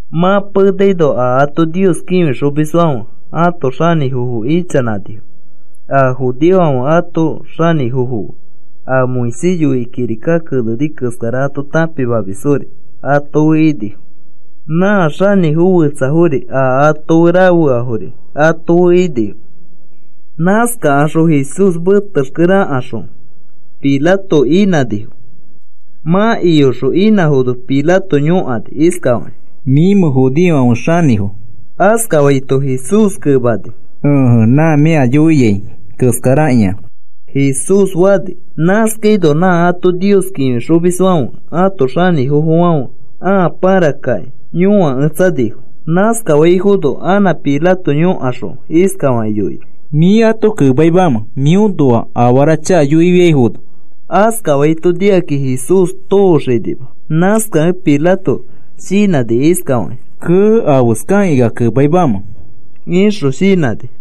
Mã penaino a ato Nios kĩfixomisfãfe ãto xanĩfofo ichanãnifo, a judeofãfe ãto xanĩfofo fe, a Moisés yoikĩ kirika keneni keskara ato tãpimamisfori ato fe inifo. Nã xanĩfo fetsafori a ato rafeafori ato fe inifo. Nãskakaxõ Jesús metexkere akaxõ iyokaxõ Pilato inãnifo. Mã iyoxõ inãfono Pilato yõkani iskafakĩ: “¿Mĩmẽ judeofãfe xanĩfo?” askafaito, Jesús kemani: “Ẽje, nã mĩ ea yoiai keskarakĩa,” Jesús fani. Nãskaino nã ato Nios kĩfixomisfãfe ãto xanĩfofofãfe ãa pãrakakĩ yõaketsanifo. Nãskafaifono anã Pilato yõkaxõ iskafakĩ yoini: “¿Mĩ ato kemaimamẽ mĩõnoa afara chakafo yoifiaifono?” Askafaito nikakĩ Jesús tooxanima. Nãskakẽ Pilato shinãni iskafakĩ: “Kee, ¿afeskakĩ ea kemaimamẽ?” ixõ shinãni.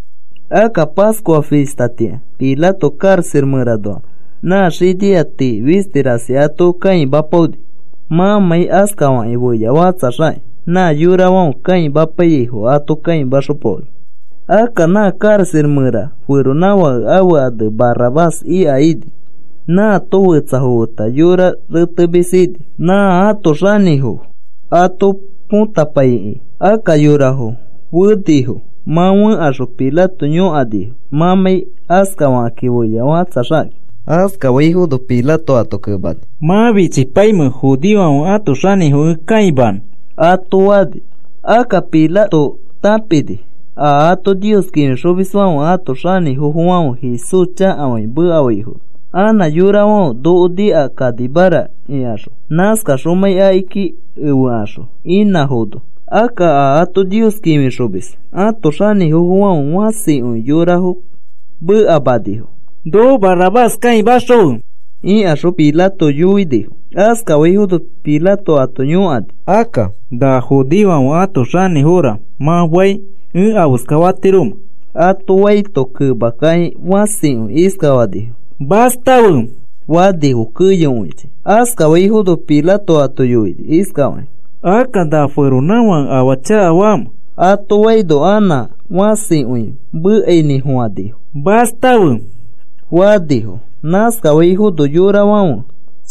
Akka Pascua fistatĩa Pilato karaxa mẽranoa nã xinia tii fisti rasi ato kãimapaoni mãmãi askafakĩ feyafakatsaxakĩ. Nã yorafãfe kãimapaiyaifo ato kãimaxopaoni. Akka nã karaxa mẽra feronãfake ãfe ane Barrabás ika ini. Nãato fetsafo feta yora retemis ini nã ãto xanĩfo ato põtapaikĩ. Akka yorafo fenifo. Mã fẽkaxõ Pilato yõkanifo mãmãi askafakĩ feyafakatsaxakakĩ. Askafaifono Pilato ato kemani: “¿Mã fichipaimẽ judeofãfe ãto xanĩfo ẽ kãimanõ?” ato fani. Akka Pilato tãpini a ato Nios kĩfixomisfãfe ãto xanĩfofofãfe Jesús chakafakĩ mekafaifono anã yorafãfe noko nikakanimara ikaxõ, nãskakaxomãi akiki efekaxõ inãfono. Akka a ato Nios kĩfixomis ãto xanĩfofofãfe fãsikõi yorafo mekamanifo: “¡Noko Barrabás kãimaxõfe!” ikaxõ Pilato yoinifo. Askafaifono Pilato ato yõkani: “Akka, ¿na judeofãfe ãto xanĩfora mã fai ẽ afeska fatiromẽ?” ato faito, kemakakĩ fãsikõi iskafanifo: “¡Mastafe!” fanifo keyokõichi. Askafaifono Pilato ato yoini iskafakĩ: “Akka, ¿na feronãfãke afaa chakafamẽ?” ato faino, anã fãsikõi mekainĩfofãnifo: “¡Mastafe!” fanifo. Nãskafaifono yorafãfe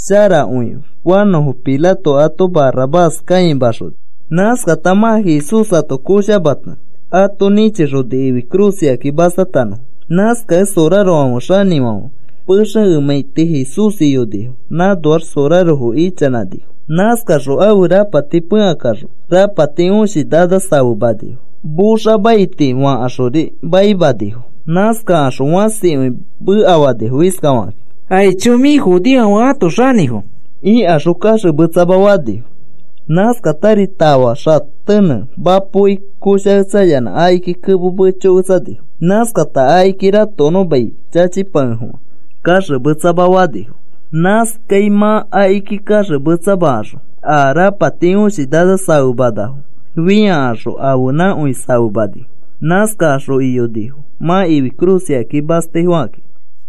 sharakõi fanõfo Pilato ato Barrabás kãimaxoni. Nãskata mã Jesús ato koshamata, ato nĩchixoni ifi cruz ikaki mastatanõfo. Nãskakẽ sorarofãfe xanĩfãfe pexe emãiti Jesús iyonifo, nãnoax sorarofo ichanãnifo. Nãskakaxõ ãfe rapati pẽkakaxõ, rapati õshi nana safemanifo, moxa maiti fakaxori maimanifo. Nãskakaxõ fãsikõi mekafanifo iskafakakĩ: “¡Aicho, mĩfi judeofãfe ãto xanĩfo!” ikaxõ kaxemetsama fanifo. Nãskatari tafa xatenẽ mapoki koshaketsayanã akiki kemo mechoketsanifo. Nãskakata akiki ratokonõ mai chachipakefofã kaxemetsama fanifo. Nãskai mã akiki kaxemetsamakaxõ a rapati õshi nana safemanafo fĩakaxõ ãfenãkõi safemanifo. Nãskakaxõ iyonifo mã ifi cruz ikaki mastaifokakĩ.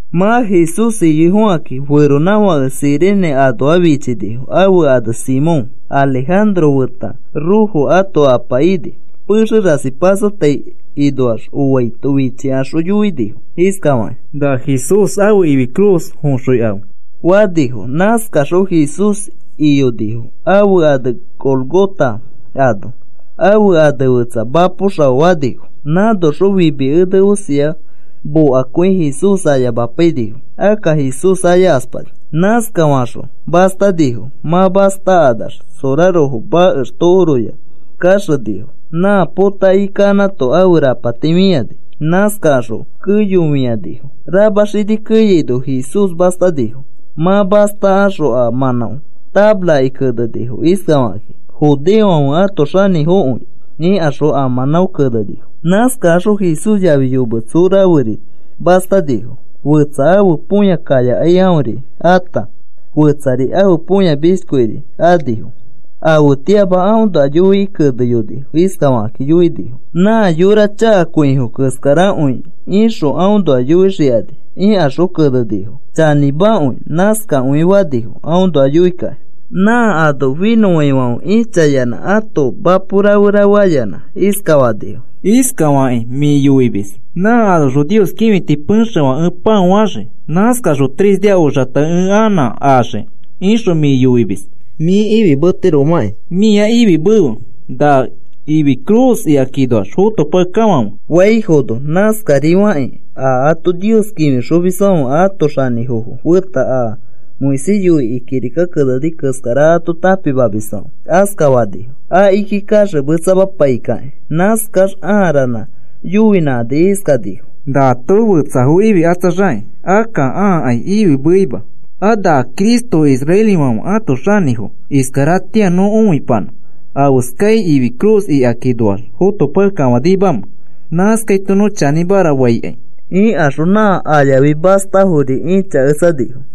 Mã Jesús iyoifokakĩ feronãfake Cirene anoa fichinifo, ãfe ane Simón. Alejandro feta Rufo ãto apa ini. Pexe rasi pasotai inoax oaito, fichikaxõ yoinifo iskafakakĩ: “Na Jesús ãfe cruz foxõikafe,” fanifo. Nãskaxõ Jesús iyonifo ãfe ane Gólgota ano. Ãfe ane fetsa Mapo Xao fanifo. Nãnoxõ fimi ene osia mokakõi Jesús ayamapainifo. Akka Jesús ayakaspani. Nãskafakaxõ mastanifo. Mã mastakanax sorarofo makex tokoroya kaxenifo. Nã potakĩ kanãto ãfe rapati fĩani. Nãskafakaxõ keyofĩanifo. Rama xini keyaino Jesús mastanifo. Mã mastakaxõ a mãnão tafaraki kenenifo iskafakakĩ: “Judeofãfe ãto Xanĩfokõi,” ikaxõ a mãnão kenenifo. Nãskakaxõ Jesús yafi yometso raferi mastanifo, fetsa ãfe põya kayakai aõri ata, fetsari ãfe põya mishkiori anifo. Afetĩama aõnoa yoikĩ keneyonifo iskafakĩ yoinifo: “Nã yora chakakõifo keskarakõi ixõ aõnoa yoixikani,” ikaxõ kenenifo. Chanĩmakõi. Nãskakõi fanifo aõnoa yoikakĩ. Nã ano finõfãifãfe ĩchayanã ãto mapo rafe rafe ayanã iskafanifo: “Iskafakĩ mĩ yoimis: ‘Nã anoxõ Nios kĩfiti pexefã ẽ pão axii. Nãskaxõ tres nia oxata ẽ anã axii,’ ixõ mĩ yoimis. Mĩ ifimetiromakĩ mĩa ifimefe na ifi cruz ikakinoax fotopakekafãfe,” faifono, nãskarifakĩ a ato Nios kĩfixomisfãfe ãto xanĩfofo feta a Moisés yoikĩ kirika keneni keskara ato tãpimamisfãfe askafanifo akiki kaxemetsamapaikakĩ. Nãskax ãa ranã yoinãkani iskanifo: “Nato fetsafo ififikatsaxakĩ, akka aakai ifimeima. A na Cristo israelifãfe ãto xanĩfo, iskaratĩa nõ õipanã afeskai ifi cruz ikakinoax fotopakekafanimamẽ, nãskaito nõ chanĩmara faikai,” ikaxõ, nã ayafi mastafori ĩchaketsanifo.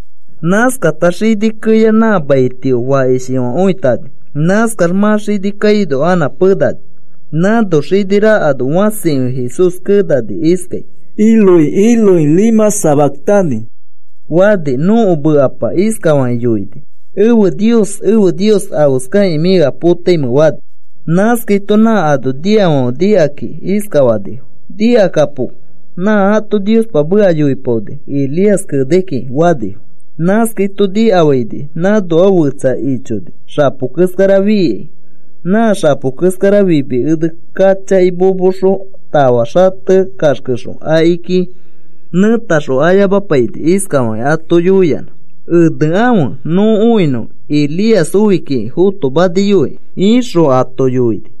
Nãskata xini keya nã mai tio fakishifãkõitani. Nãskax mã xini kaino anã penani. Nãno xini rakano fãsikõi Jesús kenani iskai: “Eloi, Eloi, ¿lema sabactani?” fani. Nõko mekapa iskafakĩ yoini: “Ẽfe Nios, ẽfe Nios, ¿afeskakĩ mĩ ea potaimẽ?” fani. Nãskaito nã ano niafãfe nikakakĩ iskafanifo: “Nikakapo, nã ato Niospa meka yoipaoni Elías kenai kiki,” fanifo. Nãskaito nikafaini nãnoa fetsa ichoni xapo keskara fiikai. Nã xapo keskara fimi ene kachaki momoxõ tafa xate kaxkexõ akiki nẽtaxõ ayamapaini, iskafakĩ ato yoiyanã: “Enekãfe nõ õinõ Elías oi kiki fotomaniyoi,” ixõ ato yoini.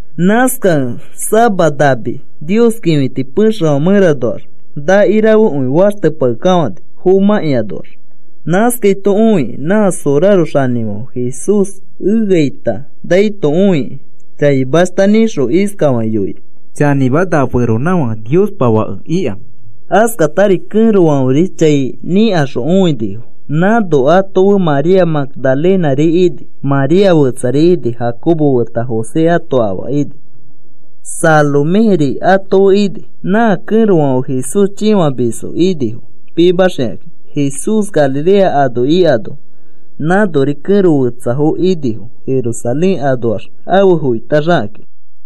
Nãskakẽ sama nami Nios kĩfiti pexefã mẽranoax naki rafekõi faxtepakekafãni fomãkĩanoax. Nãskaito õikĩ nã soraro xanĩfãfe Jesús eaita naito õikĩ chaimashta nĩxõ iskafakĩ yoini: “Chanĩma, na feronãfake Niospa Fake ika.” Askatari kẽrofãferi chai nikaxõ õinifo. Nãno ato fe María Magdalenari ini, María fetsari ini, Jacobo feta José ãto afa ini. Saloméri ato fe ini. Nã kẽrofãfe Jesús chĩfamisfo inifo, pimaxikakĩ Jesús Galilea ano ikano. Nãnori kẽro fetsafo inifo, Jerusalén anoax afe foitaxakakĩ.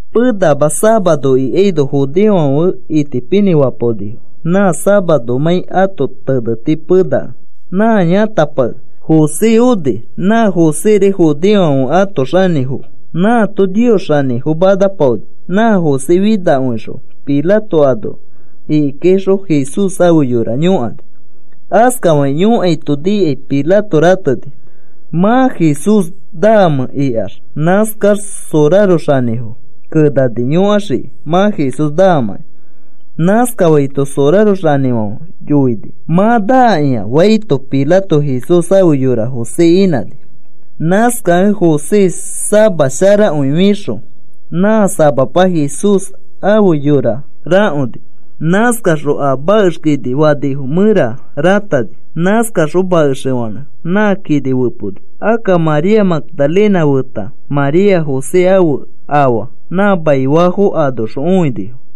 Penama safaro ikaino judeofãfe itipinĩfapaonifo, nã safaromãi ãto teneti penakẽ, nã yãtapake José oni, nã Joséri judeofãfe ãto xanĩfo. Nãato Nios xanĩfo manapaoni, nã José finakõixõ Pilato ano ikikaixõ Jesús ãfe yora yõkani. Askafakĩ yõkaito nikai Pilato rateni, “¿Mã Jesús naamẽ?” ikax. Nãskaxõ soraro xanĩfo kenani yõkaxiki mã Jesús naamakĩ. Nãskafaito soraro xanĩfãfe yoini: “Mã naakĩa,” faito, Pilato Jesús ãfe yora José inãni. Nãskakẽ José sama sharakõi fixõ nã samapa Jesús ãfe yora rakoni. Nãskaxõ a makex kini fanifo mẽra rãtani. Nãskaxõ makexefanẽ nã kini feponi. Akka María Magdalena feta María José ãfe afa nã maifaafo anoxõ õinifo.